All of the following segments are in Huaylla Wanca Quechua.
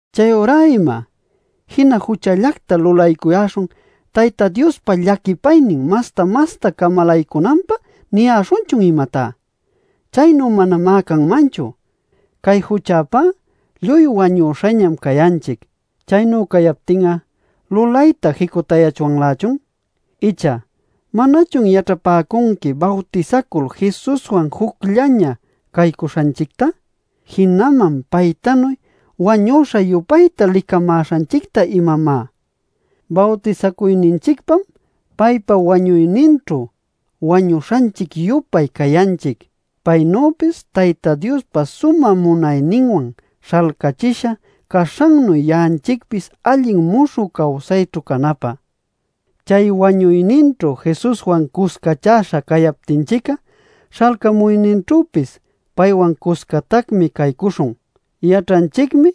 ¿Chayurá ima? ¿“Jina juchallacta lulaycuyäśhun Tayta Diospa llaquipaynin masta-masta camalaycunanpä” niyäśhunchun, imatá? ¡Chaynu manamá canmanchu! Cay juchäpá lluy wañüśhañam cayanchic. Chaynu cayaptin'a ¿lulayta jicutayachwanlächun? Icha ¿manachun yaćhapäcunqui bawtisacul Jesuswan jucllaña caycuśhanchicta, jinaman paytanuy wañüśha-yupayta licamäśhanchicta, imamá? Bawtisacuyninchicpam paypa wañuyninćhu wañuśhanchic-yupay cayanchic paynüpis Tayta Diospa sumä munayninwan śhalcächisha caśhannuy ya'anchicpis allin muśhü cawsayćhu canapä. Chay wañuyninćhu Jesuswan cuscachäśha cayaptinchic'a, śhalcamuyninćhüpis paywan cuscatacmi caycuśhun. Yaćhanchicmi,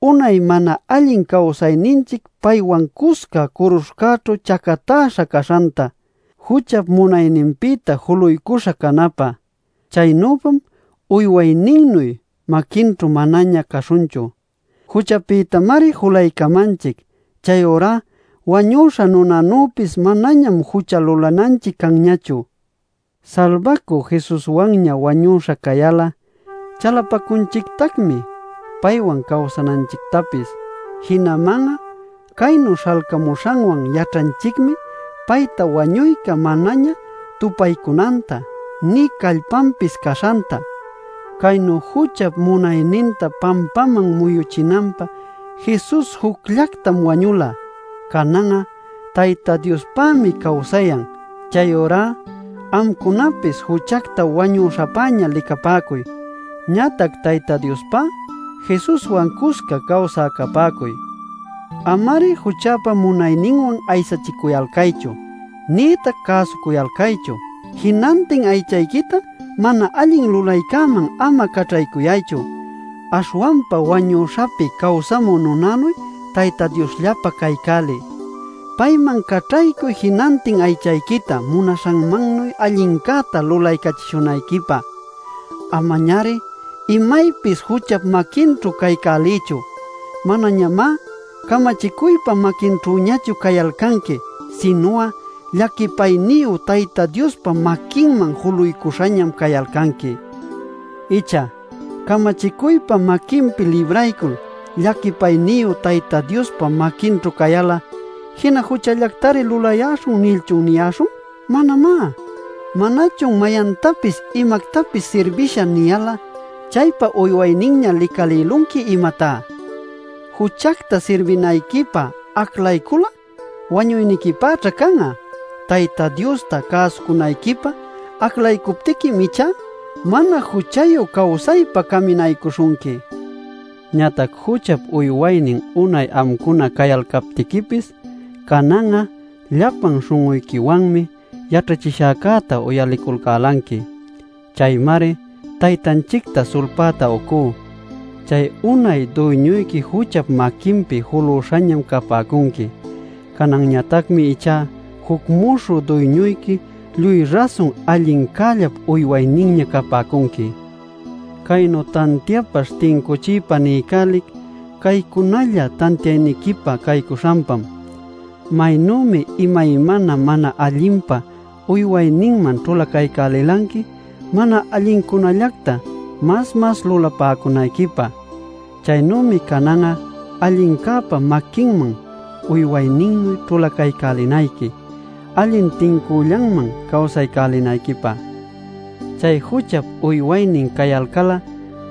unay mana allin cawsayninchic paywan cusca curuśhcäćhu chacatäśha caśhanta, juchap munayninpïta juluycuśha canapä. Chaynüpam uywayninnuy maquinćhu manaña caśhunchu. Juchapïtamari julaycamanchic; chayurá wañüśha nunanüpis manañam jucha lulananchic canñachu. Salbacü Jesuswanña wañüśha cayal'a, chalapacunchictacmi paywan cawsananchictapis. Jinaman'a caynu śhalcamuśhanwan yaćhanchicmi payta wañuyca manaña tupaycunanta nï callpanpis caśhanta. Caynu juchap munayninta pampaman muyuchinanpä Jesus jucllactam wañula. Canan'a Tayta Diospämi cawsayan. Chayurá amcunapis juchacta wañüśhapäña licapäcuy. Ñatac Tayta Diospá Jesuswan cusca cawsä capäcuy. Ama-ari juchäpa munayninwan aysachicuyalcaychu nïtac cäsucuyalcaychu. Jinantin aychayquita mana allin lulaycäman ama caćhaycuyaychu. Aśhwanpa wañüśhapi cawsamü nunanuy Tayta Diosllapä caycäliy. Payman caćhaycuy jinantin aychayquita munaśhanmannuy allincäta lulaycälichishunayquipä. Amañari imaypis juchap maquinćhu caycäliychu. Manañamá camachicuypa maquinćhüñachu cayalcanqui, sinu'a llaquipayniyu Tayta Diospa maquinman juluśhañam cayalcanqui. ¿Icha “Camachicuypa maquinpi libraycul, llaquipayniyu Tayta Diospa maquinćhu cayal'a jina juchallactari lulayäśhun” nilchun niyäśhun? ¡Manamá! ¿Manachun “Mayantapis imactapis sirbishä” niyal'a chaypa uywayninña licalïlunqui, imatá? Juchacta sirbinayquipä aclaycul'a wañuyniquipäćha can'a; Tayta Diosta cäsucunayquipä aclaycuptiquim ichá mana juchayu cawsaypä caminaycuśhunqui. Ñatac juchap uywaynin unay amcuna cayalcaptiquipis, canan'a llapan śhun'uyquiwanmi yaćhachishäcäta uyaliculcälanqui. Chaymari Taytanchicta sulpäta uycú. Chay unay duyñuyqui juchap maquinpi julüśhañam capäcunqui. Cananñatacmi ichá juc muśhü duyñuyqui lluy rasun allincällap uywayninña capäcunqui. Caynu tantiapaśh tincuchiypa niycälic caycunalla tantiayniquipä caycuśhanpam. Maynümi imaymana mana allinpa uywayninman ćhulacaycälilanqui mana allincunallacta mas-mas lulapäcunayquipä, chaynümi canan'a allincäpa maquinman uywayninnuy ćhulacaycälinayqui allin tincüllanman cawsaycälinayquipä. Chay juchap uywaynin cayalcal'a,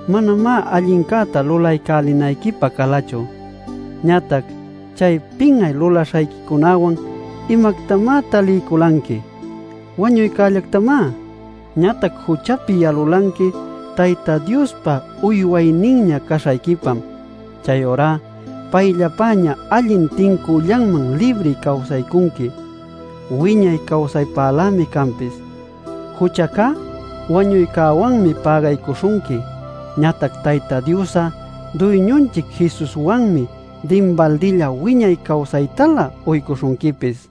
manamá allincäta lulaycälinayquipä calachu. Ñatac ¿chay pin'ay lulaśhayquicunawan imactamá taliyculanqui? ¡Wañuycällactamá! Ñatac juchapi yalulanqui Tayta Diospa uywayninña caśhayquipam; chayurá payllapäña allin tincüllanman libri cawsaycunqui, wiñay cawsaypälämi canpis. Juchacá wañuycäwanmi pägaycuśhunqui; ñatac Tayta Dios'a Duyñunchic Jesuswanmi dinbaldilla wiñay cawsaytalä uycuśhunquipis.